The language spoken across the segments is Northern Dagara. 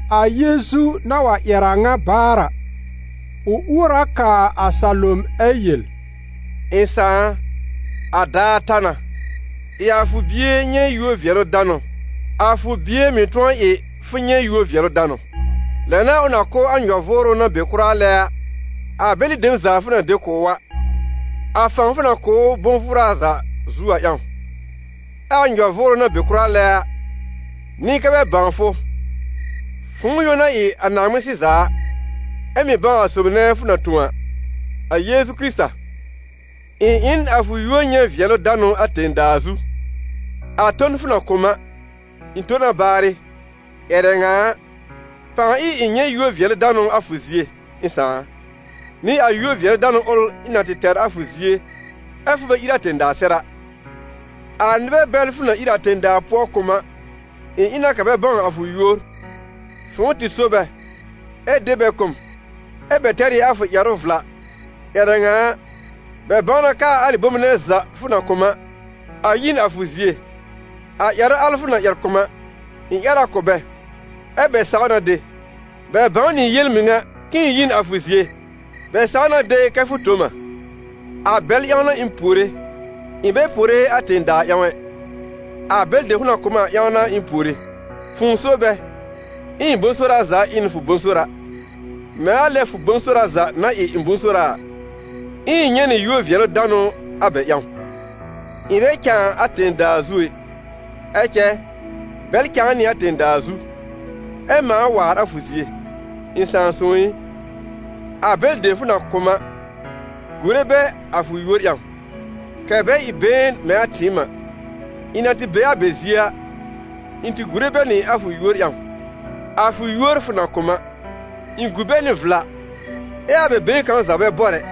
A Yeezu na wa ƴɛr a ŋa baar a, ʋ uor a kaa a salom ɛ yel: «Ɩ̃ Sãà a, a daar ta na, ɩ a fʋ Bie nyɛ̃ yúor-vɩɛlʋ-danʋ, a fʋ Bie mɩ̀ tʋ̃ɔ ɩ fʋ nyɛ̃ yúor-vɩɛlʋ-danʋ. Lɛ n'a ʋ na kʋ̀ a nyɔ-vʋʋrʋ na be kʋra lɛ a bɛlɩ dem za fʋ na de kʋ̀ ʋ a, a fãw fʋ na kʋ̀ ʋ bʋ̃-vʋʋra za zu a ƴãw. Ɛ a nyɔ-vʋʋrʋ na be kʋra lɛ a, n'ɩ kɛ́ bɛ bãw fʋ, fʋ̃ʋ yõ na ɩ a Naaŋmɩn-sɩza a, ɛ mɩ̀ bãw a sob nɛ fʋ na tõ a, a Yeezu Kɩrɩta. Ɩ̃ ɩ n a fʋ yúor nyɛ̃ vɩɛlʋ-danʋ a tẽ-daa zu. A ton fʋ na kʋ̀ m a, ɩ̃ tõ na baarɩ. Ƴɛrɛ ŋa a, pãa ɩ ɩ̃ nyɛ̃ yúor-vɩɛlʋ-danʋ a fʋ zie, ɩ̃ Sãà a, nɩ a yúor-vɩɛlʋ-danʋ ʋl ɩ̃ na tɩ tɛr a fʋ zie, ɛ́ fʋ bɛ ír a tẽ-daa sɛr a. A nɩbɛ bɛl fʋ na ír a tẽ-daa pʋɔ kʋ̀ m a, ɩ̃ ɩ na kɛ bɛ bãw a fʋ yúor. Fʋ̃ʋ tɩ so bɛ, ɛ de bɛ kʋ̀ m, ɛ́ bɛ tɛr ɩ a fʋ ƴɛrʋ vla. Ƴɛrɛ ŋa a, bɛ bãw na kɛ a alɩ bome nɛ za fʋ na kʋ̀ m a, a yi n a fʋ zie. A ƴɛrʋ al fʋ na ƴɛr kʋ̀ m a, ɩ̃ ƴɛr a kʋ̀ bɛ, ɛ́ bɛ saw na de, bɛ bãw nɩ yel-mɩŋa k'ɩ̃ɩ yi n a fʋ zie, bɛ saw na de kɛ fʋ tõ m a.» «A bɛl ƴãw n'a ɩ̃ puore, ɩ̃ bɛ puore a tẽ-daa ƴãw ɛ. A bɛlɩ dem fʋ na kʋ̀ m a ƴãw n'a ɩ̃ puore: fʋ̃ʋ so bɛ, ɛ ɩ̃ bʋ̃-sora za ɩ n fʋ bʋ̃-sora, mɛ̃ a lɛ fʋ bʋ̃-sora za na ɩ ɩ̃ bʋ̃-sora a, ɛ ɩ̃ nyɛ̃ nɩ yúor-vɩɛlʋ-danʋ a bɛ ƴãw. Ɩ̃ bɛ cãa a tẽ-daa zu ɛ, ɛ cɛ bɛl cãa nɩ a tẽ-daa zu, ɛ mãa waar a fʋ zie. Ɩ̃ Sãà sõw ɩ, a bɛlɩ dem fʋ na kʋ̀ m a, gùre bɛ a fʋ yúor ƴãw, kɛ̀ bɛ ɩ been mɛ̃ a tɩɩm a. Ɩ̃ na tɩ be a bɛ zie a, ɩ̃ tɩ gùre bɛ nɩ a fʋ yúor ƴãw, a fʋ yúor fʋ na kʋ̀ m a. Ɩ̃ gu bɛ nɩ vla, ɛ a bɛ been kãw za bɛ bɔr ɛ,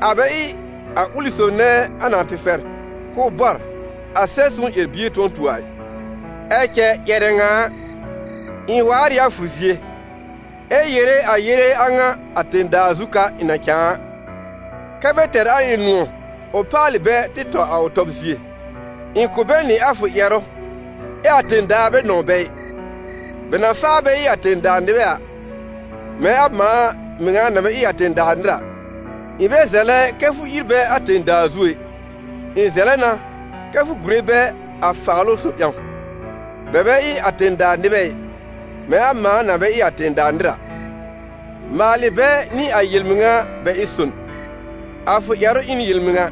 a bɛ ɩ a ʋlɩ sob nɛ a na tɩ fɛr k'ʋʋ bɔr, a Sɛb-sõw ƴɛr-bie tʋ̃ɔ tu a ɩ. Ɛ cɛ ƴɛrɛ ŋa a, ɩ̃ waar ɩ a fʋ zie, ɛ yere a yele a ŋa a tẽ-daa zu ka ɩ̃ na cãa a, kɛ́ bɛ tɛr a ɩ̃ nʋ̃ɔ̀ ʋ paalɩ bɛ tɩ tɔ a ʋ tɔb zie. Ɩ̃ kʋ̀ bɛ nɩ a fʋ ƴɛrʋ, ɛ a tẽ-daa bɛ nɔ̃w bɛ ɩ, bɛ na faa bɛ ɩ a tẽ-daa nɩbɛ a, mɛ̃ a mãa mɩŋa na bɛ ɩ a tẽ-daa nɩr a. Ɩ̃ bɛ zɛlɛ kɛ́ fʋ ír bɛ a tẽ-daa zu ɛ, ɩ̃ zɛlɛ na kɛ́ fʋ gùre bɛ a Faalʋ-sob ƴãw. Bɛ bɛ ɩ a tẽ-daa nɩbɛ ɩ, mɛ̃ a mãa na bɛ ɩ a tẽ-daa nɩr a. Maalɩ bɛ nɩ a yel-mɩŋa bɛ ɩ son: a fʋ ƴɛrʋ ɩ n yel-mɩŋa.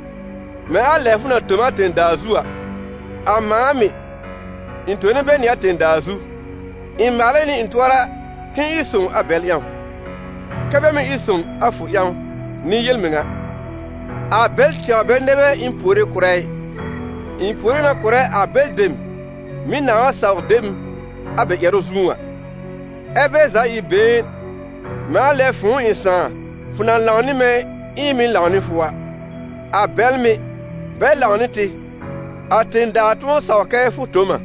Mɛ̃ a lɛ fʋ na tõ m a tẽ-daa zu a, a mãa mɩ̀, ɩ̃ tone bɛ nɩ a tẽ-daa zu. Ɩ̃ maalɛ nɩ ɩ̃ tʋɔra k'ɩ̃ɩ ɩ sõw a bɛl ƴãw, kɛ́ bɛ mɩ̀ ɩ son a fʋ ƴãw nɩ yel-mɩŋa.» «A bɛl tɛwr bɛ nɛ bɛ ɩ̃ puore kʋ̀rɛ ɩ, ɩ̃ puore na kʋ̀rɛ a bɛlɩ dem mɩ̀ nãá wa saw de m a bɛ ƴɛrʋ zũú a: ɛ́ bɛ za ɩ been, mɛ̃ a lɛ fʋ̃ʋ ɩ̃ Sãà, fʋ na lãw nɩ mɛ̃ ɛ ɩ̃ mɩ̀ lãw nɩ fʋ a. A bɛl mɩ̀, bɛ lãw nɩ tɩ, a tẽ-daa tʋ̃ɔ saw kɛ fʋ tõ m a.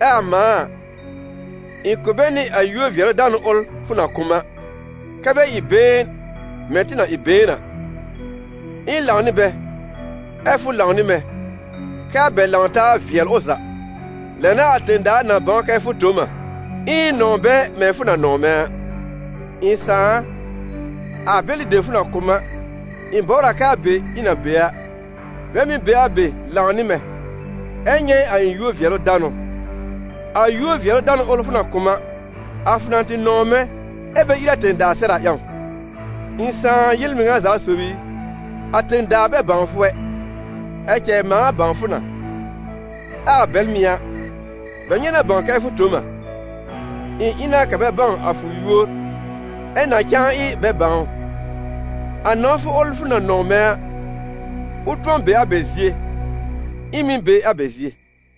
Ɛ a mãa a, ɩ̃ kʋ̀ bɛ nɩ a yúor-vɩɛlʋ-danʋ ʋl fʋ na kʋ̀ m a, kɛ́ bɛ ɩ been mɛ̃ tɩ na ɩ been a: ɩ̃ lãw nɩ bɛ, ɛ fʋ lãw nɩ mɛ̃, kɛ́ a bɛ lãw-taa vɩɛl ʋ za: lɛ n'a a tẽ-daa na bãw kɛ fʋ tõ m a, ɛ ɩ̃ nɔ̃w bɛ mɛ̃ fʋ na nɔ̃w mɛ̃ a. Ɩ̃ Sãà a, a bɛlɩ dem fʋ na kʋ̀ m a, ɩ̃ bɔbr a kɛ a be ɩ̃ na be a, bɛ mɩ̀ be a be lãw nɩ mɛ̃, ɛ nyɛ̃ a ɩ̃ yúor-vɩɛlʋ-danʋ, a yúor-vɩɛlʋ-danʋ ʋl fʋ na kʋ̀ m a, a fʋ na tɩ nɔ̃w mɛ̃ ɛ bɛ ír a tẽ-daa sɛr a ƴãw. Ɩ̃ Sãà yel-mɩŋa za sob i, a tẽ-daa bɛ bãw fʋ ɛ, ɛ cɛ mãa bãw fʋ na, ɛ a bɛl mɩ̀ a, bɛ nyɛ̃ na bãw kɛ fʋ tõ m a. Ɩ̃ ɩ na kɛ̀ bɛ bãw a fʋ yúor, ɛ na cãa ɩ bɛ bãw ʋ: a nɔ̃wfʋ ʋl fʋ na nɔ̃w mɛ̃ a, ʋ tʋ̃ɔ be a bɛ zie, ɛ ɩ̃ mɩ̀ be a bɛ zie.»